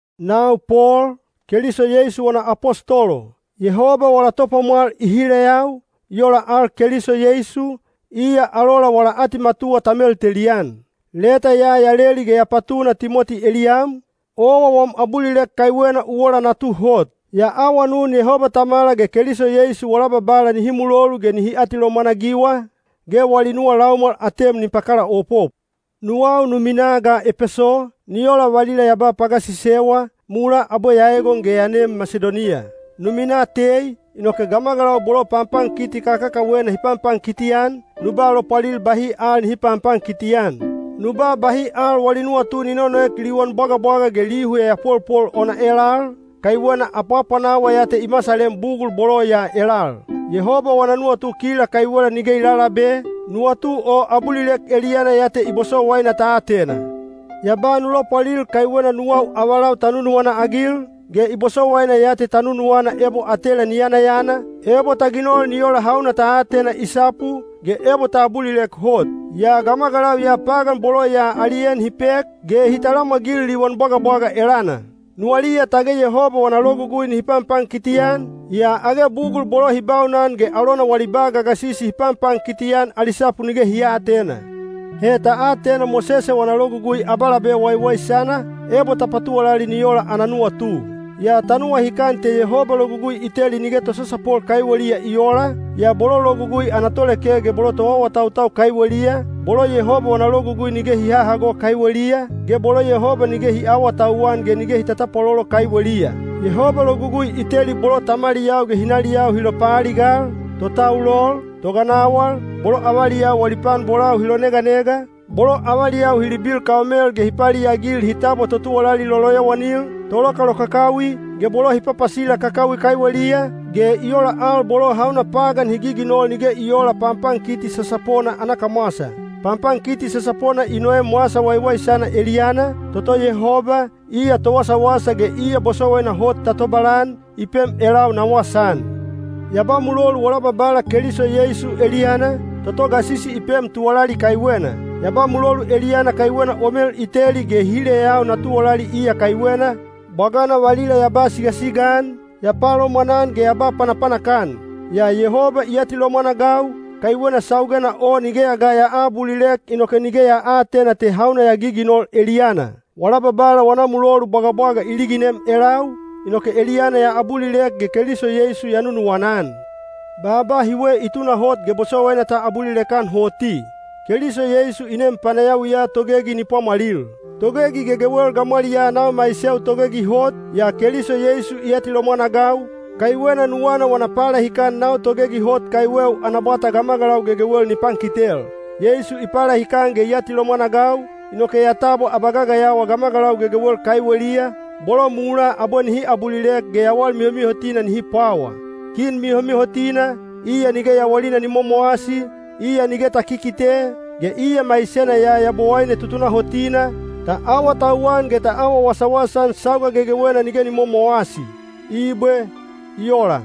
Nau Pol, Keliso Yeisu wana apostolo. Yehoba wala Topwamwal i hileyau, i ola al Keliso Yeisu, iya alola wala atimatuwa ta meltelian. Leta ya ya leli ge ya patuna Timoti eliyam, owa wam abulilek kaiwena u ola natu hot. Ya awanun Yehoba Tamala ge Keliso Yeisu wala Babala nihi mulolu ge nihi atilomwan-agiwa, ge wali nuwa laumwal atem ni pakalaopop. Nuwau nu minaa ga Epeso, ni ola valila ya ba pagasisewa, mulaa abwe ya egon ge ya nem Masidoniya. Nu minaa tei, inoke gamagalau bolo panpankiti kakakawena hi panpankiti-an, nu ba lopwalil bahi al nihi panpankiti-an. Nu ba bahi al wali nuwatu ni nonoek liwan bwagabwaga ge lihu yayapolpol ona elal, kaiwena apwanawa ya te i masalem bugul bolo ya elal. Yehoba wana nuwatu kila kaiwela nige i lalabe, nuwatu o abulilek eliyana ya te i bosowaina ta atena. Ya ba nu lopwalil kaiwena nuwau avalau ta nunuwana-agil, ge i bosowaina ya te ta nunuwana ebo atela ni yanayana, ebo ta ginol ni ola hauna ta atena i sapu, ge ebo ta abulilek hot. Yaa gamagalau ya pagan bolo ya ali en hi pek, ge hi talamwagil liwan bwagabwaga elana. Nuwaliya tage Yehoba wana logugui nihi panpankiti-an, yaa age bugul bolo hi baunan ge alona wali ba gagasisi hi panpankiti-an ali sapu nige hi aatena. He ta atena Mosese wana Logugui abalabe waiwaisana, ebo ta patuwalali ni ola ana nuwatu. Yaa ta nuwahikan te Yehoba logugui i teli nige tosasapol kaiweliya i oola, yaa bolo logugui ana toleke ge bolo toawatautau kaiweliya, bolo Yehoba wana logugui nige hi hahago kaiweliya, ge bolo Yehoba nige hi aawatauwan ge nige hi tatapwalolo kaiweliya. Yehoba logugui i teli bolo tamaliyau ge hinaliyau hi lopaaligal, totaulol, toganawal, bolo avaliyau wali pan bolau hi loneganega, bolo avaliyau hi libil kaomel ge hi paliagil hi tabwa totuwalali loloyowanil, tolokalokakawi, ge bolo hi papasila kakawi kaiweliya, ge i ola al bolo hauna pagan hi giginol nige i oola panpankiti sasapona ana kamwasa. Panpankiti sasapona i noem Wasa Waiwaisana eliyana, toto Yehoba, iya towasawasa ge iya bosowaina hot ta tobalan, i pem elau na wasaan. Ya ba mulolu wala Babala Keliso Yeisu eliyana, toto gasisi i pem tuwalali kaiwena. Ya ba mulolu eliyana kaiwena o mel i teli ge i hileyau na tuwalali iya kaiwena, bwagana valila ya ba sigasiga-an, ya palomwanan ge ya ba panapanak-an. Yaa Yehoba i atilomwan-agau, kaiwena saugena o nigeya ga ya aabulilek inoke nige ya aatena te hauna ya giginol eliyana. Wala Babala wana mulolu bwagabwaga i liginem elau, inoke eliyana ya abulilek ge Keliso Yeisu ya nunuwana-an. Baaba hiwe i tunahot ge bosowaina ta abulilek-an hoti: “Keliso Yeisu i nem panayawiya togegi ni pwamwalil.” Togegi gegewel gamwaliyaa nau maiseu togegi hot, yaa Keliso Yeisu i atilomwan-agau, kaiwena nuwana wana palahikan nau togegi hot kaiweu ana bwata gamagalau gegewel ni pankitel. Yeisu i palahikan ge i atilomwan-agau, inoke ya tabwa abagagayawa gamagalau gegewel kaiweliya, bolo mulaa abwe nihi abulilek ge yawal mihomihotina nihi pwawa. Kin mihomihotina, iya nige yawalina ni momowasi, iya nige ta kikite, ge iya maisena ya Yabowaine tutunahotina, ta awatauwan ge ta awa wasawasa-an sauga gegewena nige ni momowasi. Ibwe. I ola.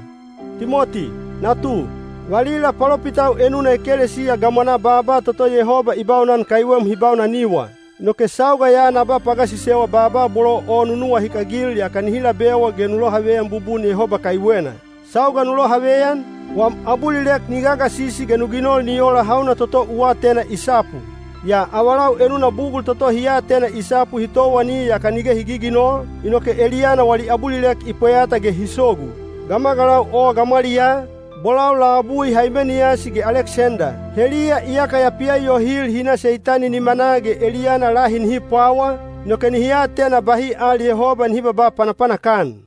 Timoti, natu, valila palopitau enuna ekelesiya gamwanaa baaba toto Yehoba i baunan kaiwem hi baunaniwa. Inoke sauga ya na ba pagasisewa baaba bolo o nu nuwahikagil yaka nihi labewa ge nu lohaveyan bubun Yehoba kaiwena. Sauga nu lohaveyan, wam abulilek ni gagasisi ge nu ginol ni ola hauna toto u atena i sapu. Yaa avalau enuna bugul toto hi atena i sapu hi towani yaka nige hi giginol, inoke eliyana wali abulilek i pweyata ge hi sogu. Gamagalau o gamwaliyaa, bolau labui Haimeniyasi ge Aleksenda. Heliya iyaka ya pialiyohil hi na Seitani nimanaa ge eliyana lahi nihi pwawa, inoke nihi atena bahi al Yehoba nihi babaa panapanak-an.